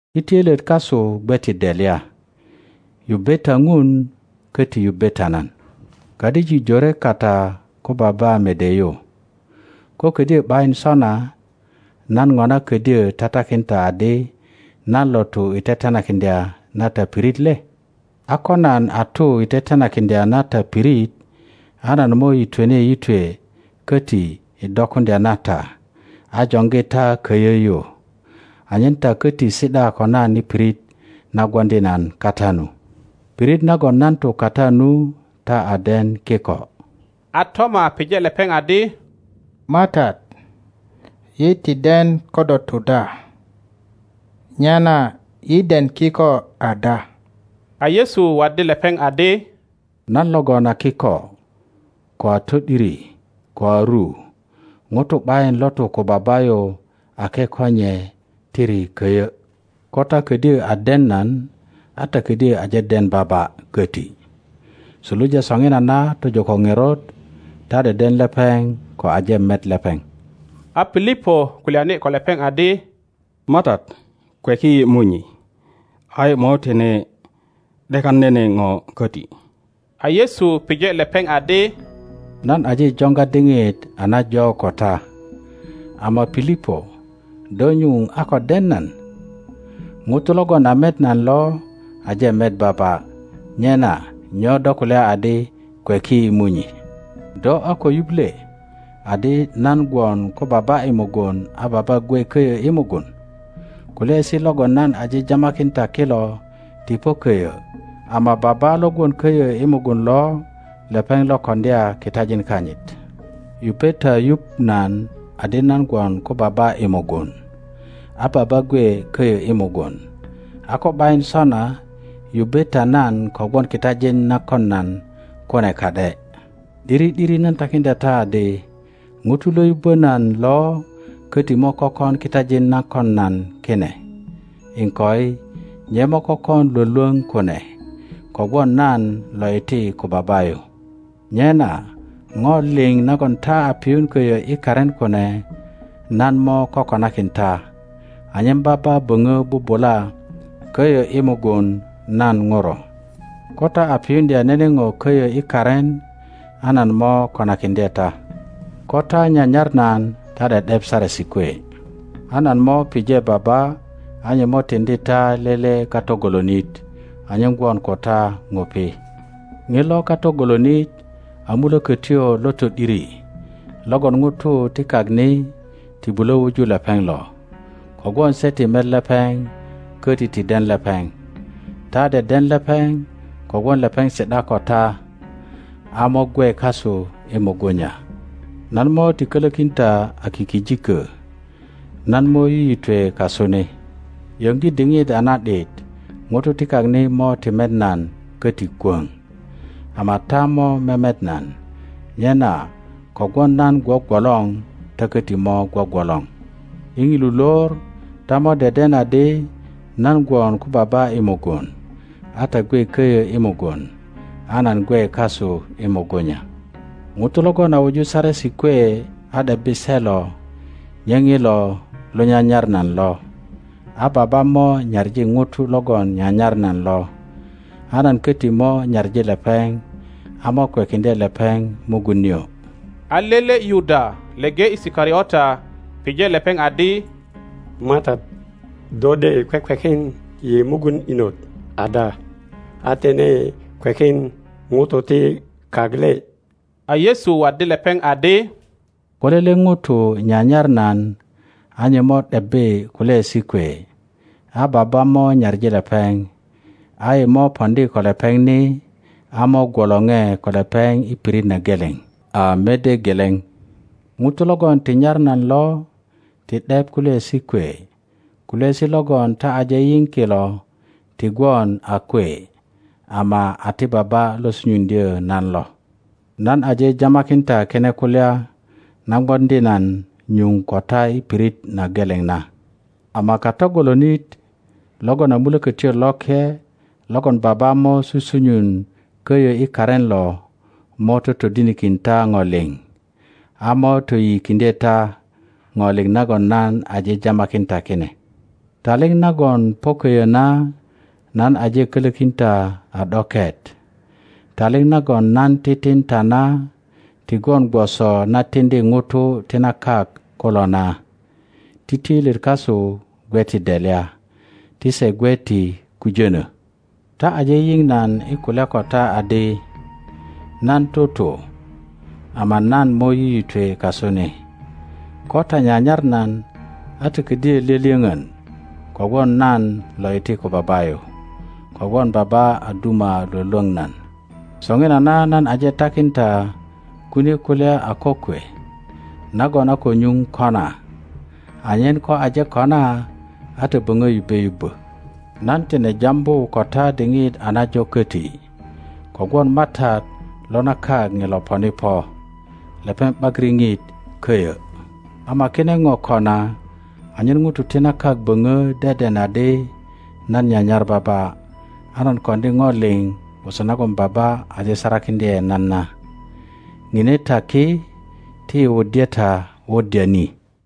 Ti töilyet kasu gwe ti delya. Yubbe ta Ŋun, köti yubbe ta nan. Kadijik jore kata ko Baba mede yu. Ko kodyö ’bayin sona, nan ŋona ködyö tatakin ta adi nan lo tu i tetenakiŋdya na ta pirit le? A ko nan a tu i tetenakiŋdya na ta pirit, a nan mo yitweni yitwe köti i dokuŋdya na ta a joŋgi ta köyö yu, anyen ta köti si ’da ko nan i pirit na gwoŋdi nan kata nu. Pirit nagon nan tu kata nu ta a den kiko. A Toma pije lepeŋ adi, MATAT, yi ti den ko do tu da; nyena yi den kiko ada? A Yesu waddi lepeŋ adi, Nan logon a kiko, ko a to ’diri, ko a ru. Ŋuto ’bayin lo tu ko Baba yu ake ko nye tiri köyo. Ko ta kodyo a den nan, a ta ködyo aje den Baba köti. Suluja soŋinana tojo ko ŋerot, ta deden lepeŋ ko aje met lepeŋ. A Pilipo kulyani ko lepeŋ adi, MATAT, kweki yi Munyi, a yi mo tine ’dekan nene ŋo köti. A Yesu pije lepeŋ adi, Nan aje joŋga diŋit a najo ko ta, ama Pilipo do nyuŋ a ko den nan? Ŋuto logon a met nan lo aje met Baba. Nyena nyo do kulya adi, Kweki yi Munyi? Do a ko yuŋ le adi nan gwon ko Baba i mugun a Baba gwe köyö i mugun? Kulyaesi logon nan aje jamakin ta kilo ti po köyö; ama Baba lo gwon köyö i mugun lo lepeŋ lo koŋdya kitajin kanyit. Yupe ta yuŋ nan adi nan gwon ko Baba i mugun, a Baba gwe köyö i mugun; a ko ’bayin sona yubbe ta nan kogwon kitajin na kon nan kune ka ’de. ’Diri ’diri nan takiŋdya ta adi, ŋuto lo yubbö nan lo köti mo kökon kitajin na kon nan kine, iŋkoi, nye mo kökon lwölwöŋ kune, kogwon nan lo iti ko Baba yu. Nyena ŋo liŋ nagon ta a piyun köyö i karin kune, nan mo kokonakin ta, anyen Baba böŋö bubula köyö i mugun nan ŋuro. Ko ta a piyuŋdya nene ŋo köyö i karin, a nan mo konakiŋdye ta. Ko ta nyanyar nan ta ’de ’dep saresi kwe; a nan mo pije Baba, a nye mo tiŋdi ta lele Kato golonit anyen gwon ko ta ŋupi. Ŋilo Kato golonit a Mulökötyo lo to ’diri logon ŋutu ti kak ni ti bulö wuju lepeŋ lo, kogwon se ti met lepeŋ köti ti den lepeŋ. Ta deden lepeŋ kogwon lepeŋ si ’da ko ta a mo gwe kasu i mugunya. Nan mo ti kölökin ta a kikijikö; nan mo yiyitwe kasu ni. Yöŋgi diŋit a na ’dit ŋutu ti kak ni mo ti met nan köti kwöŋ, ama ta mo memet nan. Nyena kogwon nan gwogwolor ta köti mo gwogwolor. I ŋilu lor ta mo deden adi nan gwon ko Baba i mugun, a ta gwe köyö i mugun, a nan gwe kasu i mugunya. Ŋuto logon a wuju saresi kwe a ’debbi se lo, nye ŋilo lo nyanyar nan lo; a Baba mo nyaŋi ŋuto logon nyanyar nan lo, a nan köti mo nyaŋi lepeŋ a mo kwekiŋdye lepeŋ mugun nio. A lele Yuda leŋe Isikariota, pije lepeŋ adi, MATAT, do de kwekwekin yi mugun inot ada, a tine kwekin ŋutu ti kak le? A Yesu waddi lepeŋ adi, Ko lele ŋuto nyanyar nan a nye mo ’debbi kulyaesi kwe, a Baba mo nyaŋi lepeŋ, a yi mo poŋdi ko lepeŋ ni, a mo gwolore ko lepeŋ i pirit na geleŋ a mede geleŋ. Ŋuto logon ti nyar nan lo ti ’dep kulyaesi kwe; kulyaesi logon ta aje yiŋ kilo ti gwon a kwe, ama a ti Baba lo sunyuŋdyö nan lo. Nan aje jamakin ta kine kulya na gwoŋdi nan nyuŋ ko ta i pirit na geleŋ na; ama Kato golonit logon a Mulökötyo Loke, logon Baba mo susunyun köyö i karin lo, mo totodinikin ta ŋo liŋ, a mo toyiyikiŋdye ta ŋo liŋ nagon nan aje jamakin ta kine. Taliŋ nagon po köyö na nan aje kölökin ta a ’doket. Taliŋ nagon nan titin ta na ti gwon gwoso na tiŋdi ŋutu ti na kak kulo na. Ti töilyet kasu gwe ti delya, ti se gwe ti kujönö. Ta aje yiŋ nan i kulya ko ta adi, Nan tutu, ama nan mo yiyitwe kasu ni. Ko ta nyanyar nan, a ta ködyö lyölyöŋön kogwon nan lo iti ko Baba yu, kogwon Baba a duma lwölwöŋ nan. Soŋinana nan aje takin ta kine kulya a kokwe nagon a ko nyuŋ kona, anyen ko aje kona a ta böŋö yubbe yubbö. Nan tine jambu ko ta diŋit a najo köti, kogwon matat lo na kak ŋilo poni po. Lepeŋ ’bak riŋit köyö; ama kine ŋo kona anyen ŋutu ti na kak böŋö deden adi nan nyanyar Baba, a nan koŋdi ŋo liŋ gwoso nagon Baba aje sarakiŋdye nan na. Ŋine ta ki, ti yi wuddye ta wuddya ni.